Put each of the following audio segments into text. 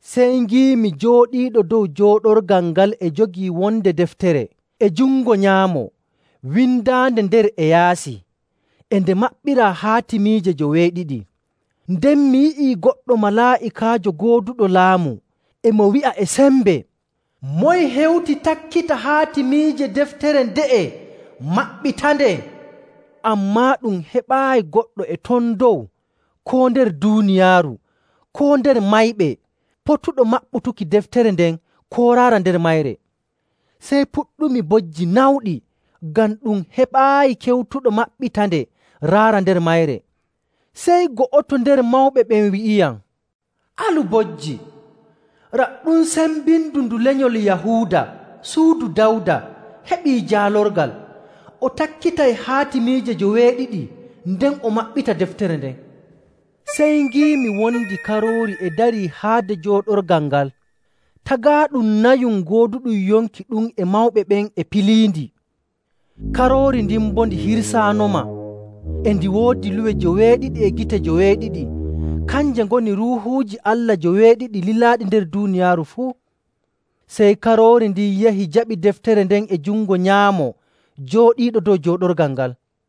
Sey ngiimi jooɗiiɗo dow jooɗorgal ngal e jogii wonde deftere e jungo nyaamo windaande nder e yaasi, e nde maɓɓiraa haatimiije joweeɗiɗi. Nden mi yi'i goɗɗo malaa'ikaajo gooduɗo laamu e mo wi'a e sembe, “Moye hewti takkita haatimiije deftere nde'e maɓɓitande?” Ammaa ɗum heɓaayi goɗɗo e ton dow koo nder duuniyaaru koo nder mayɓe potuɗo maɓɓutuki deftere nden koo raara nder mayre. Sey puɗɗumi bojji nawɗi ngam ɗum heɓaayi kewtuɗo maɓɓitande raara nder mayre. Sey go'oto nder mawɓe ɓen wi'iyam, “Alu bojji. Raɗɗum sembindu ndu lenyol Yahuuda, suudu Dawda, heɓii jaalorgal, o takkitay haatimiije joweeɗiɗi nden o maɓɓita deftere nden.” Sey ngiimi wondi Karoori e darii haade jooɗorgal ngal. Tagaaɗum nayum gooduɗum yonki ɗum e mawɓe ɓen e piliindi. Karoori ndin bo ndi hirsaanoma. E ndi woodi luwe joweeɗiɗi e gite joweeɗiɗi, kanje ngoni Ruuhuuji Allah joweeɗiɗi lilaaɗi nder duuniyaaru fuu. Sey Karoori ndin yahi jaɓi deftere nden e jungo nyaamo jooɗiiɗo dow jooɗorgal ngal.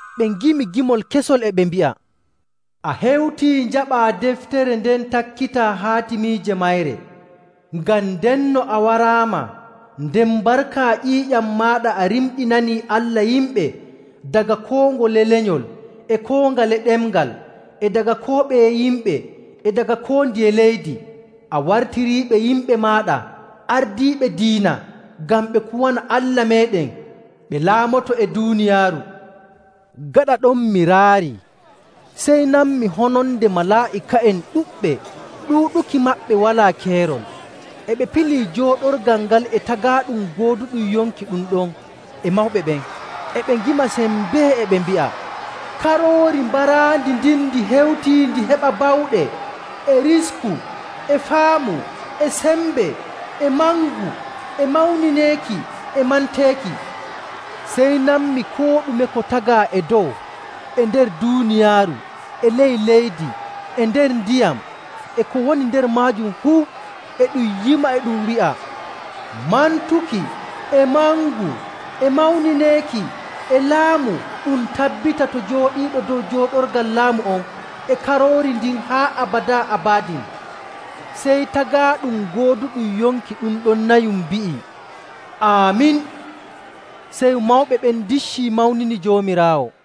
Ɓe ngimi gimol kesol e ɓe mbi'a, “A hewtii njaɓaa deftere nden takkitaa haatimiije mayre, ngam ndenno a waraama, nden barka ƴiiƴam maaɗa a rimɗinanii Allah yimɓe daga koo ngole lenyol, e koo ngale ɗemngal, e daga koo ɓeye yimɓe, e daga koo ndiye leydi. A wartiriiɓe yimɓe maaɗa ardiiɓe diina ngam ɓe kuwana Allah meeɗen, ɓe laamoto e duuniyaaru.” Gaɗa ɗon mi raarii, sey nanmi hononde malaa'ika'en ɗuɗɓe, ɗuuɗuki maɓɓe walaa keerol. E ɓe pilii jooɗorgal ngal e tagaaɗum gooduɗum yonki ɗum ɗon e mawɓe ɓen, e ɓe ngima sembee e ɓe mbi'a, “Karoori baraandi ndin ndi hewtii ndi heɓa bawɗe, e risku, e faamu, e sembe, e mangu, e mawnineeki, e manteeki!” Sey nanmi koo ɗume ko tagaa e dow, e nder duuniyaaru, e ley leydi, e nder ndiyam, e ko woni nder maajum fuu, e ɗum yima e ɗum wi'a, “Mantuki, e mangu, e mawnineeki, e laamu ɗum tabbita to Jooɗiiɗo dow jooɗorgal laamu on, e Karoori ndin haa abadaa abadin!” Sey tagaaɗum gooduɗum yonki ɗum ɗon nayum mbi'i, “Aamin!” Sey mawɓe ɓen ndiccii mawnini Joomiraawo.